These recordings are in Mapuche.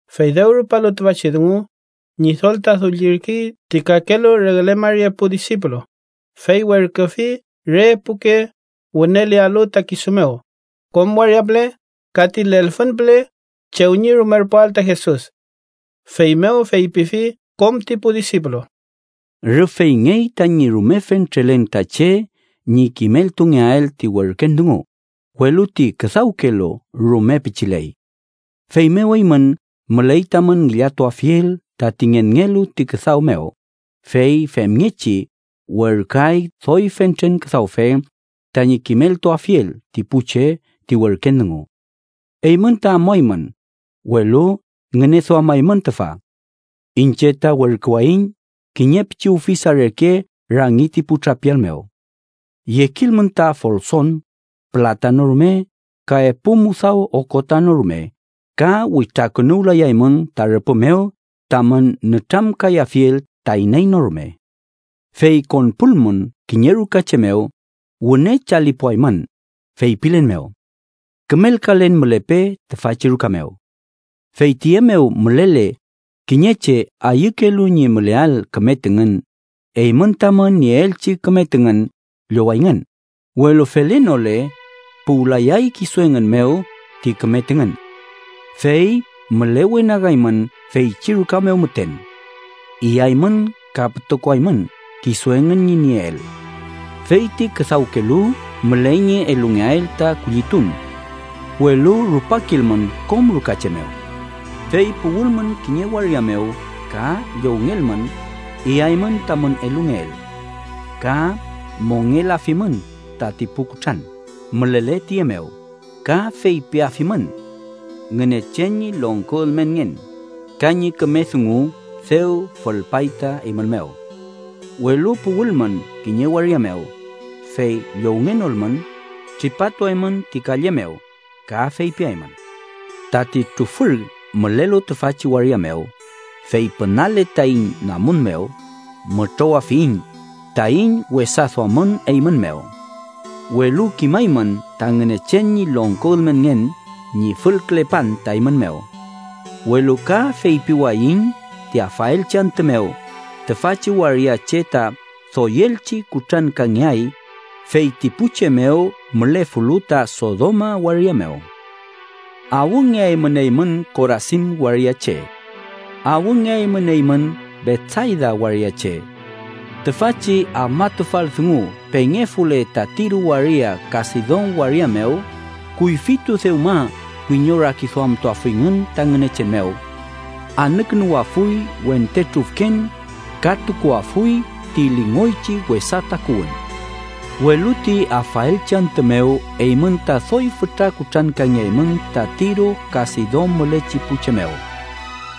Fey dew rupalu tüfachi dungu, Ñidol ta dullirkey ti kakelu regle mari epu disipulu, fey werküfi re epuke wünelealu ta kisu mew, kom waria püle ka ti lelfün püle chew ñi rumerpuael ta Jesus. Feymew feypifi kom ti pu disipulu: “Rüf feyngey tañi rume fentrelen ta che ñi kimeltungeael ti werken dungu, welu ti küdawkelu rume pichiley. Feymew eymün müley tamün ngillatuafiel tati ngenngelu ti küdaw mew, fey femngechi werküay doy fentren küdawfe tañi kimeltuafiel ti pu che ti werken dungu. Eymün ta amuaymün, welu ngüneduamaymün tüfa. Iñche ta werküwayiñ kiñe pichi ufisa reke rangi ti pu trapial mew. Yekilmün ta folson, pülata no rume ka epu mudaw okota no rume ka witrakünuwlayaymün ta rüpü mew tamün nütramkayafiel ta iney no rume. “Fey konpulmün kiñe ruka che mew, wüne chalipuaymün, feypilen mew: ‘Kümelkalen mülepe tüfachi ruka mew.’ Fey tüye mew mülele kiñe che ayükelu ñi müleael küme tüngün, eymün tamün nieelchi küme tüngün llowayngün, welu felenole, puwlayay kisu engün mew ti küme tüngün. Fey mülewenagaymün feychi ruka mew müten. Iyaymün ka pütokoaymün kisu engün ñi nieel. Fey ti küdawkelu müley ñi elungeael ta kullitun. Welu rupakilmün kom ruka che mew. “Fey puwülmün kiñe waria mew ka llowngelmün, iyaymün tamün elungeel. Ka mongelafimün tati pu kutran mülele tüye mew, ka feypiafimün: ‘Ngünechen ñi longko ülmenngen ka ñi küme dungu dew fülpay ta eymün mew.’ Welu puwülmün kiñe waria mew, fey llowngenolmün, tripatuaymün ti kalle mew ka feypiaymün: ‘¡Tati trufür mülelu tüfachi waria mew, fey pünale taiñ namun mew, mütrowafiyiñ taiñ wesa duamün eymün mew! Welu kimaymün ta Ngünechen ñi longko ülmenngen ñi fülkülepan ta eymün mew.’ “Welu ka feypiwayiñ ti afaelchi antü mew, tüfachi waria che ta doyelchi kutrankangeay, fey ti pu che mew mülefulu ta Sodoma waria mew. “¡Awngeaymün eymün Korasin waria che! ¡Awngeaymün eymün Betsayda waria che! Tüfachi afmatufal dungu pengefule ta Tiro waria ka Sidon waria mew, kuyfitu dewma wiñorakiduamtuafuyngün ta Ngünechen mew. Anükünuwafuy wente trufken ka tukuafuy ti lingoychi wesa takuwün. Welu ti afaelchi antü mew eymün ta doy fütra kutrankangeaymün ta Tiro ka Sidon mülechi pu che mew.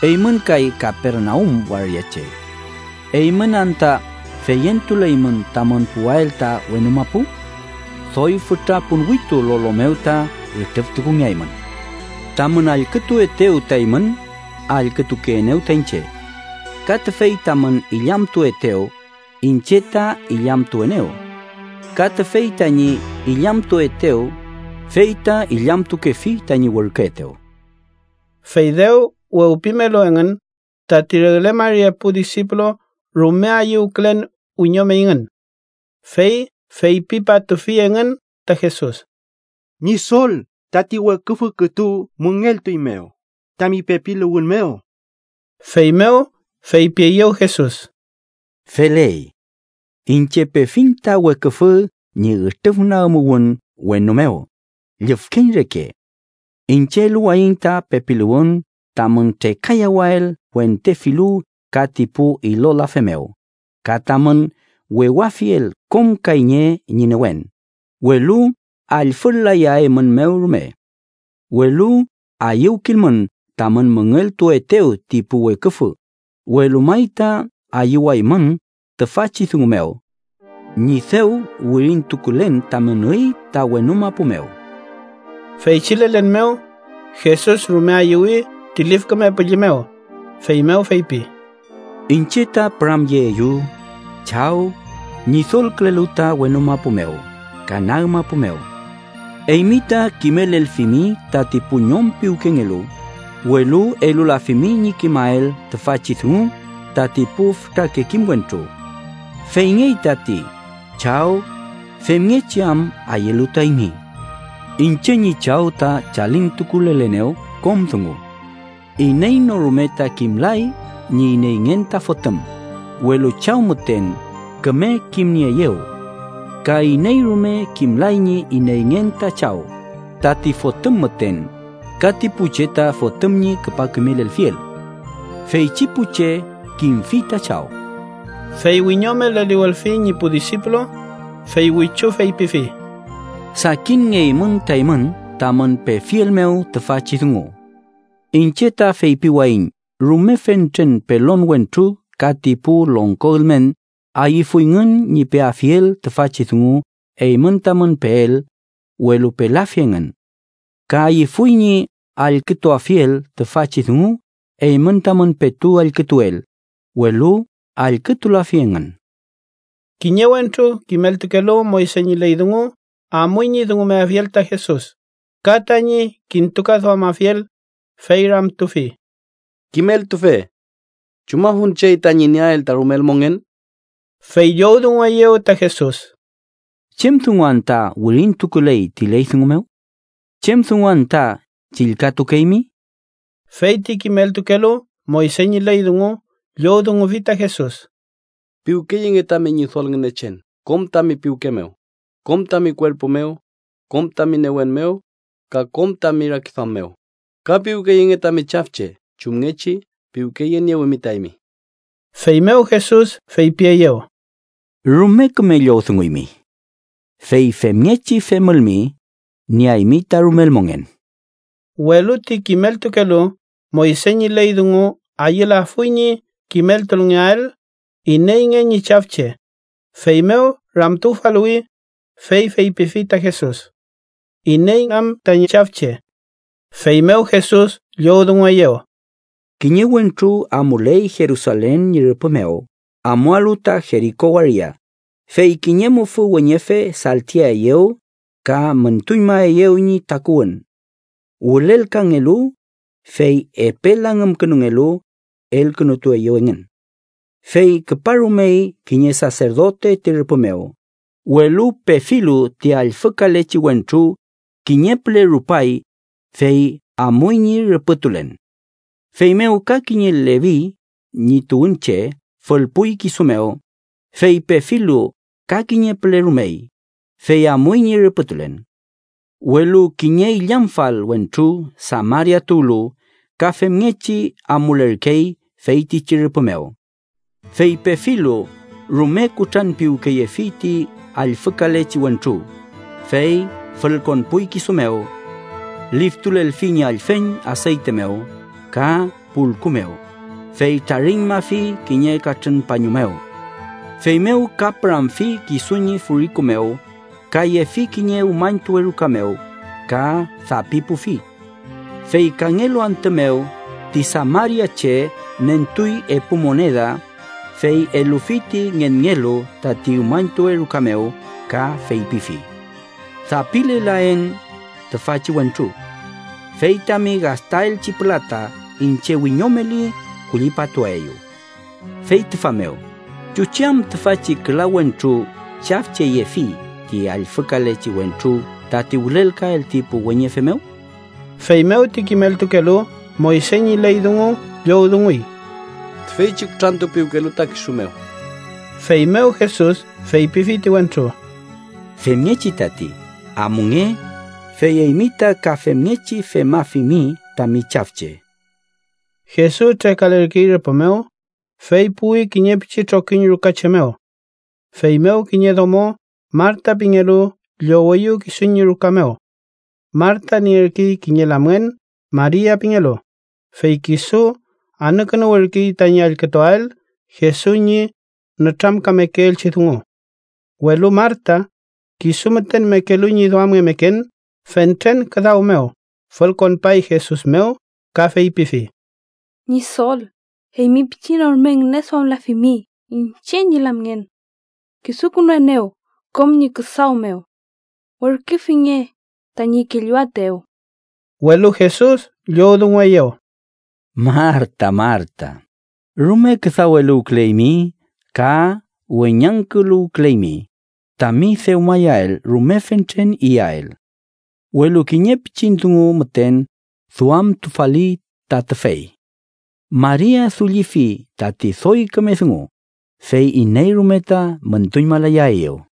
Eymün kay Kapernaum waria che. ¿Eymün anta feyentuleymün tamün puwael ta wenu mapu? ¡Doy fütra ponwitu lolo mew ta ütrüftukungeaymün! “Tamün allkütuetew ta eymün, allkütukeenew ta iñche. Ka tüfey tamün illamtuetew, iñche ta illamtuenew. Ka tüfey tañi illamtuetew, fey ta illamtukefi tañi werküetew.” Fey dew wewpimelu engün, tati regle mari epu disipulu rume ayüwkülen wiñomeyngün. Fey feypipatufi engün ta Jesus: —¡Ñidol, tati weküfü kütu müngeltueiñmew tami pepiluwün mew! Feymew feypieyew Jesus: —Feley. Iñche pefiñ ta weküfü ñi ütrüfnagümuwün wenu mew llüfkeñ reke. Iñche eluwayiñ ta pepiluwün tamün trekayawael wente filu ka ti pu ilolafe mew, ka tamün wewafiel kom kayñe ñi newen, welu allfül-layaeymünmew rume. Welu ayüwkilmün tamün müngeltuetew ti pu weküfü, welu may ta ayüwaymün tüfachi dungu mew: ñi dew wirintukulen tamün üy ta wenu mapu mew. Feychi lelen mew, Jesus rume ayüwüy ti Lif Küme Püllü mew, feymew feypi: “Iñche ta püramyeeyu, Chaw, Ñidolkülelu ta wenu mapu mew ka nag mapu mew. Eymi ta kimelelfimi tati pu ñom piwkengelu, welu elulafimi ñi kimael tüfachi dungu tati pu fütrake kim wentru. Feyngey tati, Chaw, femngechi am ayülu ta eymi. “Iñche ñi Chaw ta chalintukulelenew kom dungu. Iney no rume ta kimlay ñi ineyngen ta Fotüm, welu Chaw müten küme kimnieeyew. Ka iney rume kimlay ñi ineyngen ta Chaw, tati Fotüm müten ka ti pu che ta Fotüm ñi küpa kimelelfiel. Feychi pu che kimfi ta Chaw.” Fey wiñome leliwülfi ñi pu disipulu, fey wichu feypifi: “Sakinngeymün ta eymün tamün pefiel mew tüfachi dungu. Iñche ta feypiwayiñ rume fentren pelon wentru ka ti pu longko ülmen ayüfuyngün ñi peafiel tüfachi dungu eymün tamün peel, welu pelafi engün. Ka ayüfuy ñi allkütuafiel tüfachi dungu eymün tamün petu allkütuel, welu allkütulafi engün.” Kiñe wentru kimeltukelu Moyse ñi ley dungu amuy ñi dungumeafiel ta Jesus, ka tañi kintukaduamafiel, fey ramtufi: —Kimeltufe, ¿chumafun chey tañi nieael ta rumel mongen? Fey llowdungueyew ta Jesus: —¿Chem dungu anta wirintukuley ti ley dungu mew? ¿Chem dungu anta chillkatukeymi? Fey ti kimeltukelu Moyse ñi ley dungu llowdungufi ta Jesus: —‘Piwkeyenge tami Ñidol Ngünechen kom tami piwke mew, kom tami kuerpu mew, kom tami newen mew, ka kom tami rakiduam mew’, ka ‘piwkeyenge tami chafche chumngechi piwkeyeniewimi ta eymi.’ Feymew Jesus feypieyew: —Rume küme llowdunguymi. Fey femngechi femülmi, nieaymi ta rumel mongen. Welu ti kimeltukelu Moyse ñi ley dungu ayülafuy ñi kimeltulngeael ineyngen ñi chafche, feymew ramtufaluwi, fey feypifi ta Jesus: —¿Iney am tañi chafche? Feymew Jesus llowdungueyew: —Kiñe wentru amuley Jerusalen ñi rüpü mew amualu ta Jeriko waria, fey kiñe mufü weñefe saltiaeyew ka müntuñmaeyew ñi takuwün. Wülelkangelu, fey epe langümkünungelu, elkünutueyew engün. Fey küparumey kiñe saserdote ti rüpü mew, welu pefilu ti allfükalechi wentru, kiñe püle rupay, fey amuy ñi rüpütulen. Feymew ka kiñe Levi ñi tuwünche fülpuy kisu mew, fey pefilu, ka kiñe püle rumey, fey amuy ñi rüpütulen. Welu kiñe illamfal wentru Samaria tuwlu ka femngechi amulerkey feytichi rüpü mew. Fey pefilu, rume kutranpiwkeyefi ti allfükalechi wentru, fey fülkonpuy kisu mew. Liftulelfi ñi allfen aseyte mew ka pulku mew, fey trariñmafi kiñe katrün pañu mew. Feymew ka püramfi kisu ñi furiku mew, ka yefi kiñe umañtuwe ruka mew ka dapipufi. Fey kangelu antü mew ti samariache nentuy epu moneda, fey elufi ti ngenngelu tati umañtuwe ruka mew ka feypifi: ‘Dapilelaen tüfachi wentru. Fey tami gastaelchi pülata, iñche wiñomeli, kullipatuaeyu.’ Fey tüfa mew, ¿chuchi am tüfachi küla wentru chafcheyefi ti allfükalechi wentru tati wülelkael ti pu weñefe mew? Feymew ti kimeltukelu Moyse ñi ley dungu llowdunguy: —Tüfeychi kutrantupiwkelu ta kisu mew. Feymew Jesus feypifi ti wentru: —Femngechi tati. Amunge, fey eymi ta ka femngechi femafimi tami chafche. Jesus trekalerkey rüpü mew, fey puwi kiñe pichi trokiñ ruka che mew. Feymew kiñe domo Marta pingelu lloweyew kisu ñi ruka mew. Marta nierkey kiñe lamngen Maria pingelu, fey kisu anükünuwürkey tañi allkütuael Jesus ñi nütramkamekeelchi dungu. Welu Marta, kisu müten mekelu ñi duamngemeken fentren küdaw mew, fülkonpay Jesus mew ka feypifi: —Ñidol, ¿eymi pichi no rume ngüneduamlafimi iñche ñi lamngen? Kisukünuenew kom ñi küdaw mew. Werküfinge tañi kelluaetew. Welu Jesus llowdungueyew: —Marta, Marta, rume küdaweluwküleymi ka weñangküluwküleymi tami dewmayael rume fentren iyael. Welu kiñe pichin dungu müten duamtufali ta tüfey. Maria dullifi tati doy küme dungu, fey iney rume ta müntuñmalayaeyew.